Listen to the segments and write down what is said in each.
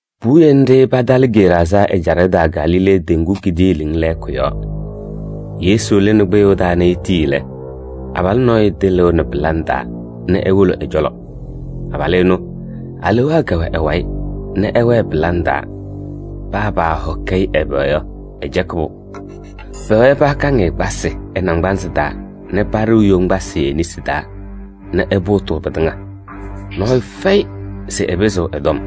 Puwiye nɖɩ patalɩ Geraazaa ɛjaɖɛ taa Galilee teŋgu kidiiliŋ lɛɛkʋ yɔɔ. Yesu lɩnɩ kpɩyʋʋ taa nɛ etii lɛ, abalʋ nɔɔyʋ tɩlɩʋnɩ pɩlaŋ taa nɛ ewolo ɛ-cɔlɔ. Abalʋ ɛnʋ, alewaa kɛwɛ ɛ-wayɩ nɛ ɛwɛɛ pɩlaŋ taa, paa paahɔkɩ-ɩ ɛbɛ yɔ, ɛcɛkɩ-pʋ. Pɛwɛɛ pakaŋ-ɩ kpasɩ ɛ-naŋgbanzɩ taa nɛ paɖɩɣ yoŋgbasɩ e-nesi taa nɛ ɛpʋʋtɩ pɩtɩŋa. Nɔɔyʋ fɛyɩ se ɛpɩzɩɣ ɛ-tɔm.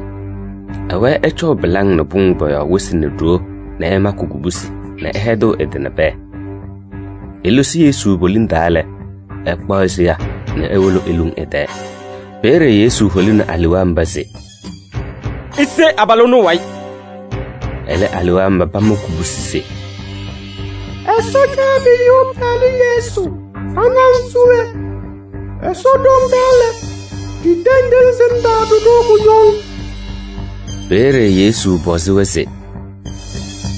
Ɛwɛɛ ɛcɔʋ pɩlaŋ nɛ pʋŋ pɔ-yɔɔ wɩsɩ nɛ ɖoo nɛ ɛmakɩ kubusi nɛ ɛhɛdɩɣ ɛ-tɩ nɛ pɛɛ. Elosi Yesu poliŋ taa lɛ, ɛkpaɣ seya nɛ ewolo eluŋ ɛ-tɛɛ. Peeye Yesu holini alewaa mba se: “Ise abalʋ ɛnʋ ɛ-wayɩ.” Ɛlɛ, alewaa mba pama kubusi se: “Ɛsɔ Caabiyuu Pɩyalʋ Yesu, ɖa nɛ ŋ se we? Ɛsɔ ɖoŋ taa lɛ, ɖitendiɣ-ŋ se ŋtaaɖʋ-ɖʋ kʋñɔŋ.” Peeye Yesu pɔzɩ-wɛ se: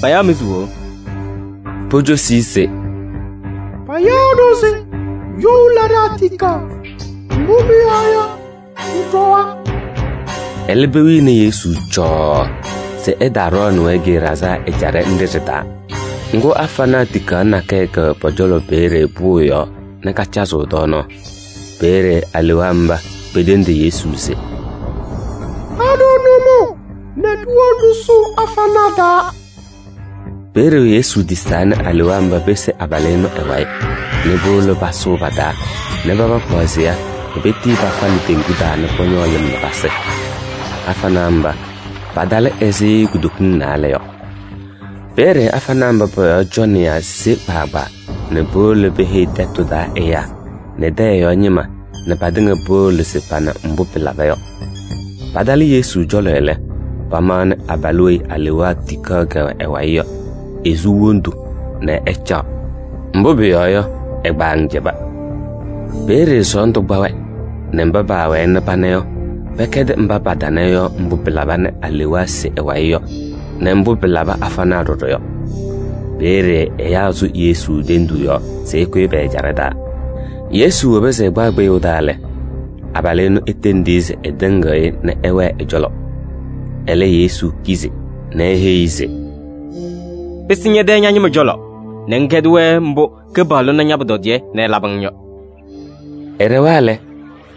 “Payaɣ-mɩ se we?” Pocosi-i se: “Payaɣ-ɖʋ se you laɖaa tikaɣ, mbʋ pʋyɔɔ yɔ, ɖɩɖɔwa.” Ɛlɛ, pewini Yesu cɔɔɔ se ɛtaaɖɔɔnɩ-wɛ Geraazaa ɛjaɖɛ nɖɩ ɖɩ-taa. Ŋgʋ, afanaa tikaɣ nakɛyɛ kɛwɛ pɔ-cɔlɔ peeye pʋʋ yɔɔ nɛ kacazɩɣ tɔɔnaɣ. Peeye alewaa mba petendi Yesu se: “Ha-ɖʋ nʋmɔʋ nɛ ɖiwolo ɖɩsʋʋ afanaa taa.” Peeye Yesu tisaa nɛ alewaa mba pese abalʋ ɛnʋ ɛ-wayɩ nɛ powolo pasʋʋ pa-taa nɛ paba kpaɣ seya nɛ petii pafalɩ teŋgu taa nɛ pɔñɔɔ lɩm nɛ pasɩ. Afanaa mba, patalɩ ɛzɩ kutokiŋ naalɛ yɔ. Peeye afanaa mba pɔ-yɔɔ cɔnɩyaa sewa kpaagbaa nɛ powolo peheyi tɛtʋ taa ɛyaa nɛ tɛyɛ yɔɔ ñɩma nɛ patɩŋa powolo se pana mbʋ pɩlaba yɔ. Patalɩ Yesu cɔlɔ lɛ, pamaɣnɩ abalʋ weyi alewaa tikaɣ kɛwɛ ɛ-wayɩ yɔ, esu wondu nɛ ɛcaɣ. Mbʋ pʋyɔɔ yɔ, ɛ-kpaŋ cɛba. Peeye sɔɔndʋ kpa-wɛ nɛ mba paawɛɛ nɛ pana yɔ, pɛkɛdɩ mba patana yɔ mbʋ pɩlaba nɛ alewaa se ɛ-wayɩ yɔ nɛ mbʋ pɩlabɩ afanaa ɖɔɖɔ yɔ. Peeye ɛyaa sʋ Yesu tenduu yɔɔ se ɛkʋyɩ pɛ-ɛjaɖɛ taa. Yesu woba se ɛkpaɣ kpɩyʋʋ taa lɛ, abalʋ ɛnʋ etendi-i se ɛtɩŋɩɣ-ɩ nɛ ɛwɛɛ ɛ-cɔlɔ. Ɛlɛ, Yesu kizi nɛ eheyi-i se: “Pɩsɩ ñɛ-tɛ ña-ñɩma cɔlɔ nɛ ŋkɛdɩ-wɛ mbʋ Kɩpaɣlʋ na ña-pʋtɔdɩyɛ nɛ ɛlabɩ-ŋ yɔ.” Ɛɖɛwa lɛ,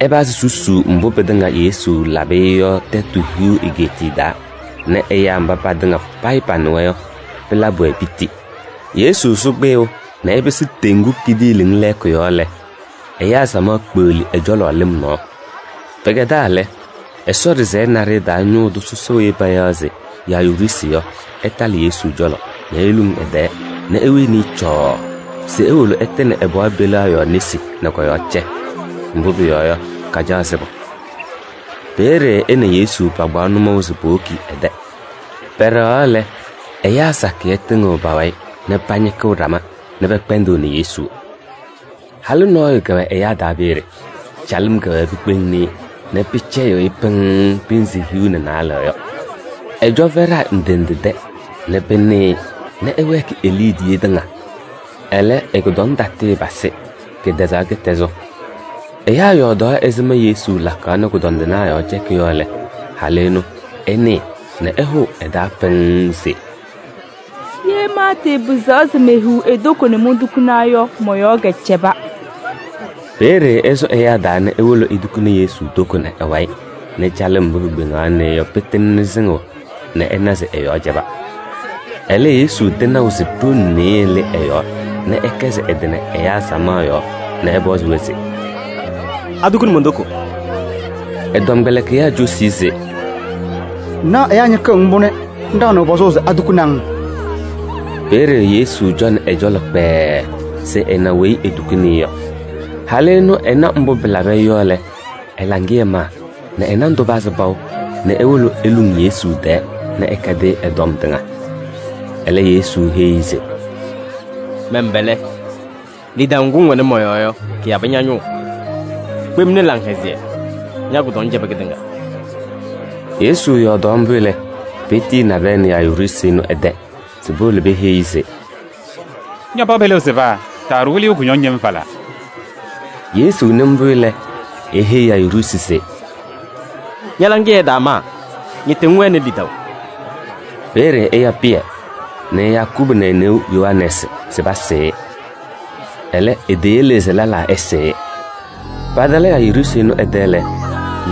ɛpazɩ susuu mbʋ pɩtɩŋa Yesu labɩ-ɩ yɔ Tɛtʋ Hiu Egeetiye taa nɛ ɛyaa mba patɩŋa payɩ panɩwa yɔ, pɩlabɩ-wɛ piti. Yesu sʋ kpɩyʋʋ nɛ ɛpɩsɩ teŋgu kidiiliŋ lɛɛkʋ yɔɔ lɛ, ɛyaa samaɣ kpeɣli ɛ-cɔlɔ lɩm nɔɔ. Pɩkɛdaa lɛ, Ɛsɔ ɖɩsɛyɛ naɖɩyɛ taa ñʋʋ tʋ sɔsɔ weyi payaɣ se Yayiruusi yɔ, ɛtalɩ Yesu cɔlɔ nɛ eluŋ ɛ-tɛɛ nɛ ewini-i cɔɔɔ se ewolo ɛtɩnɩ ɛ-pɩɣa peliɣa yɔɔ nesi nɛ kɔ-yɔɔ cɛ. Mbʋ pʋyɔɔ yɔ, kacaɣ sɩbʋ. Peeye ɛ nɛ Yesu pakpaɣ nʋmɔʋ se powoki ɛ-tɛ. Pɛɖɛɣaɣ lɛ, ɛyaa sakɩyɛ tɩŋɩɣ pa-wayɩ nɛ pañɩkɩɣ ɖama nɛ pɛkpɛndɩɣnɩ Yesu. Halʋ nɔɔyʋ kɛwɛ ɛyaa taa peeye. Calɩm kɛwɛɛ pikpeŋni-i nɛ pɩcɛyɩɣ-ɩ pɩŋŋ pɩnzɩ hiu nɛ naalɛ yɔ. Ɛcɔ fɛɖaa ndɩ ndɩ tɛ nɛ pɩnɩ-ɩ nɛ ɛwɛɛkɩ e-liidiye tɩŋa. Ɛlɛ, ɛ-kʋdɔŋ tatɩɩpasɩ, kɩtɛzaɣ kɩtɛzʋ. Ɛyaa yɔɔdaɣ ɛzɩma mbʋ Yesu lakaɣ nɛ kʋdɔndɩnaa yɔɔ cɛkɩ yɔ lɛ, halʋ ɛnʋ ɛnɩɩ nɛ ɛhʋʋ ɛ-taa pɩŋŋ se: “Ye maatɩɩpɩzaɣ se mehiɣ e-toko nɛ montukuna yɔ, mɔ-yɔɔ kɛcɛba.” Peeye ɛsʋ ɛyaa taa nɛ ewolo etukuni Yesu toko nɛ ɛ-wayɩ nɛ calɩm mbʋ pikpeŋaɣnɩ-ɩ yɔ, pɩtɩŋnɩ sɩŋʋʋ nɛ ɛna se ɛ-yɔɔ cɛba. Ɛlɛ, Yesu tɩnaʋ se ɖoŋ nɩɩyɩ lɩ ɛ-yɔɔ nɛ ɛkɛzɩ ɛ-tɩ nɛ ɛyaa samaɣ yɔɔ nɛ ɛpɔzɩ-wɛ se: “Atukuni mon-toko?” Ɛ-tɔmkpɛlɩkɩyaa cosi-i se: “Ŋnaɣ ɛyaa ñɩkɩɣ-ŋ mbʋ nɛ ŋɖaɣnɩɣ pɔzʋʋ se atukuni-ŋ?” Peeye Yesu cɔnɩ ɛ-cɔlɔ kpɛɛɛ se ɛna weyi etukuni-i yɔ. Halʋ ɛnʋ ɛna mbʋ pɩlabɩ-ɩ yɔ lɛ, ɛ-laŋɩyɛ maa nɛ ɛ-nandʋ pazɩ paʋ nɛ ewolo eluŋ Yesu tɛɛ nɛ ɛkɛdɩ-ɩ ɛ-tɔm tɩŋa. Ɛlɛ, Yesu heyi-i se: “Mɛn-pɛlɛ! Lidaʋ ŋgʋ ŋwɛnɩ mɔ-yɔɔ yɔ, kɩyabɩ ña-ñʋʋ. Kpemni laŋhɛzɩyɛ, ña-kʋdɔŋ cɛbɩ kɩtɩŋa.” Yesu yɔɔdaɣ mbʋ lɛ, petiyi nabɛyɛ nɛ Yayiruusi ɛnʋ ɛ-tɛ se powolo peheyi-i se: “Ña-pɩɣa peliɣa sɩba, taaɖʋ Wɩlɩyʋ kʋñɔŋ yem falaa.” Yesu nɩ mbʋ lɛ, eheyi Yayiruusi se: “Ña-laŋɩyɛ ɛtaamaa, ñɩtɩ ŋwɛnɩ lidaʋ.” Peeye ɛya Pɩyɛ nɛ Yakubu nɛ e-neu Yohanɛɛsɩ se pasɩɩ-ɩ. Ɛlɛ, eteyele se lɛlaa ɛsɩɩ-ɩ. Patalɩ Yayiruusi ɛnʋ ɛ-tɛ lɛ,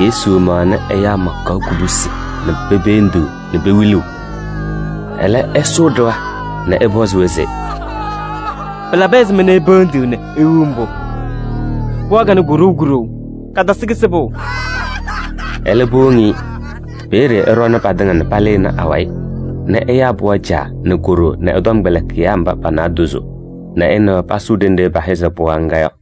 Yesu maɣnɩ ɛyaa makaɣ kubusi nɛ pependiɣ nɛ pewiliɣ. Ɛlɛ, ɛsʋʋ ɖɩɣa nɛ ɛpɔzɩ-wɛ se: “Pɩlabɩ ɛzɩma nɛ ipeendiɣ nɛ iwiɣ mbʋ? Pɩɣa kanɛ koɖou kuɖou, katasɩ kɩsɩbʋ.” Ɛlɛ, powoŋ-i. Peeye ɛɖɔɔnɩ patɩŋa nɛ palɩnɩ awayɩ nɛ ɛyaa pɩɣa caa nɛ ko-ɖoo nɛ ɛ-tɔmkpɛlɩkɩyaa mba pa-naadozo nɛ ɛ nɛ wɛ pasʋʋ ɖenɖe pɛhɛzɩ pɩɣa ŋga yɔ.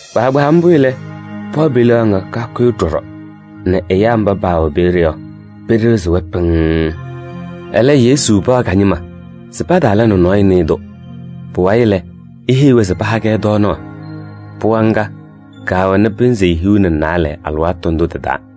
Kpaagbaa mbʋ lɛ, pɩɣa peliɣa ŋga kakʋyɩ kɔɖɔ nɛ ɛyaa mba paawɛ peeye yɔ, pɩɖɩɣzɩ-wɛ pɩŋŋ. Ɛlɛ, Yesu paɣ ka-ñɩma se pataala nɛ nɔɔyʋ nɩɩ-tʋ. Pʋwayɩ lɛ, eheyi-wɛ se paha-kɛ tɔɔnaɣ. Pɩɣa ŋga, kaawɛnɩ pɩnzɩ hiu nɛ naalɛ alɩwaatʋ ndʋ tɩ-taa.